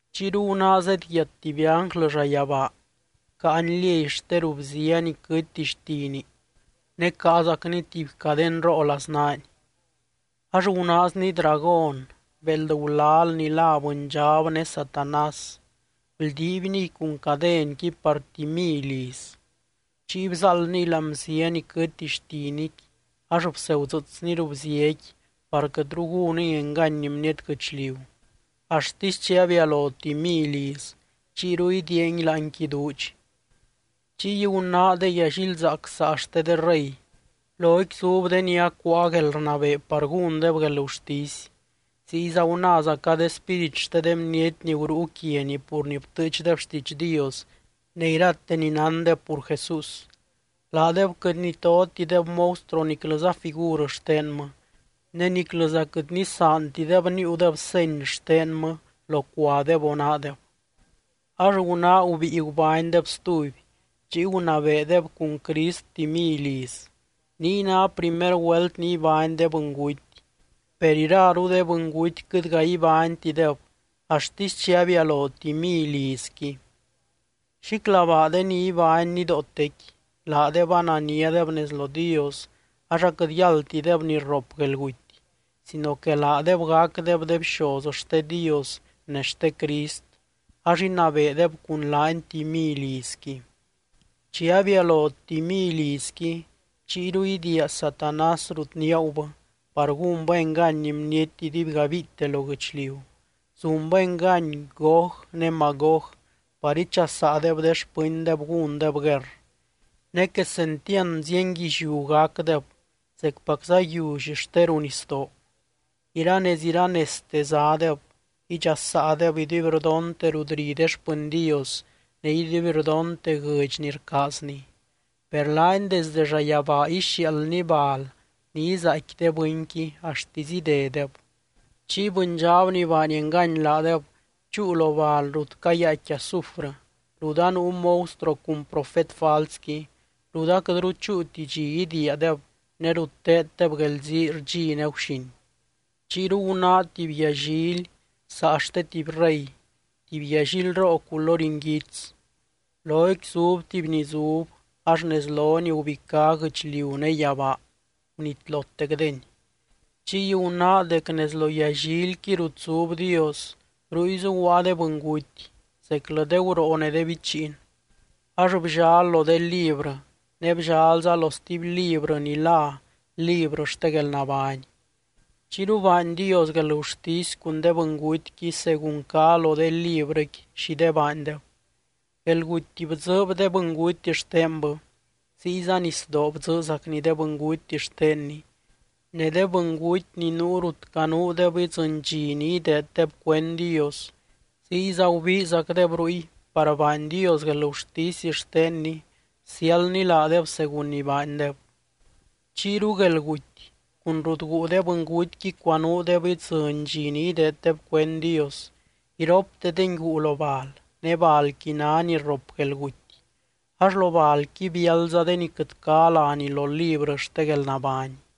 Chiyru gunáa zedyiat tuby ánglɨ llayabaa, caany liey xte ruu bzia ni quɨtti xtini ne caazacny tuby cadenroo laznaany. Ax gunaazny dragón, béeld gulal ni lá Bɨndxab ne Satanás, bldiibniy cun cadenqui par tuby mily iz. Chiy bzáaldniy láani bzia ni quɨtti xtiniqui ax bsegudzɨɨsny ruu bziaqui par quɨtru gúniy engany bniety guɨchliu axtisy chi abialo tuby mily iz, chiyru idiiangui láanqui duudx. Chiy gunáa de yallilzaac saa xte de rey, loqui zub de ni acuáa guelrnabee par gúndeb guelgurtisy. Ziyza gunáazaca de spírit xte de bniety ni gurúu quiani pur ni btɨɨchdeb xtiidx Dios ne irate ni nándeb pur Jesús. Laadeb quɨt nitotideb monstruo niclɨza figur xtenmɨ, ne niclɨza quɨt nisaantideb níiudeb seny xtenmɨ locuadeb o naadeb. Ax gunáa gubíi gubánydeb stuby, chiy gunabeedeb cun Crist tuby mily iz. Niy ná primer güelt ni ibány de bɨnguty, per iraru de bɨnguty quɨtga ibánytideb axtisy chi abialo tuby mily izqui. ¡Xíclabaa de ni ibány nidootequi! Laadeb ananiadeb nez lo Dios ax aquɨt yáldtideb ni rrop guelguty, sino que laadeb gacdeb de bxoz xte Dios ne xte Crist ax inabeedeb cun laany tuby mily izqui. Chi abialo tuby mily izqui, chiyru idiia Satanás rut niaagubɨ par gúnbɨ engany bniety iduibgabiite lo guɨchliu. Zunbɨ engany Gog ne Magog par ichasaadeb de xpɨndeb gúndeb guerr. Ne quesentiand zienguilliú gacdeb zecpacza yiully xte ruu nisdoo. Iranez iranezte zádeb, idxasaadeb iduibrdonte rut ri de xpɨny Dios ne iduibrdonte guɨdx ni rcaazny. Per laany desde llayabaa ixiaaldny bal ni izaaicqui de bɨnqui axtisy idedeb. Chiy bɨndxab ni baany engany laadeb chúu lo bal rut cayaaicqui azufrɨ, rut anuu monstruo cun profet falsqui, rut aquɨtru chúuti dxi idiiadeb ne rut teeddeb guelzii rdxi ne guxin. Chiyru gunáa tuby yallily saa xte tuby rey, tuby yallilroo culory nguits. Loqui zub tuby ni zub ax nez lony gubicá guɨchliu ne yabaa, gunitlotecdeni. Chiy gunáa dec nez lo yallilqui rut zub Dios, ruy zuguaa de bɨnguty, zeclɨ de guroo ne de bichiin. Ax bllal lo de librɨ, ne bllalza lo stuby librɨ ni lá librɨ xte guelnabány. Chiyru baany Dios guelgurtisy cun de bɨngutyqui según cá lo de librɨqui xi de baandeb. Guelguty bdzɨɨb de bɨnguty xtenbɨ, ziyza nisdoo bdzɨɨzacni de bɨnguty xtenni, ne de bɨnguty ni nuu rut canuudeb idzɨny dxi ni ideeddeb cuend Dios, ziyza gubiizacdeb ruy par baany Dios guelgurtisy xtenny bsiáldny laadeb según ni baandeb. Chiyru guelguty cun rut guu de bɨngutyqui cuanuudeb idzɨny dxi ni ideeddeb cuend Dios, iroptedengui guu lo bal, ne balquiy ná ni rrop guelguty. Ax lo balqui biáldza de ni quɨt cá láni lo librɨ xte guelnabány.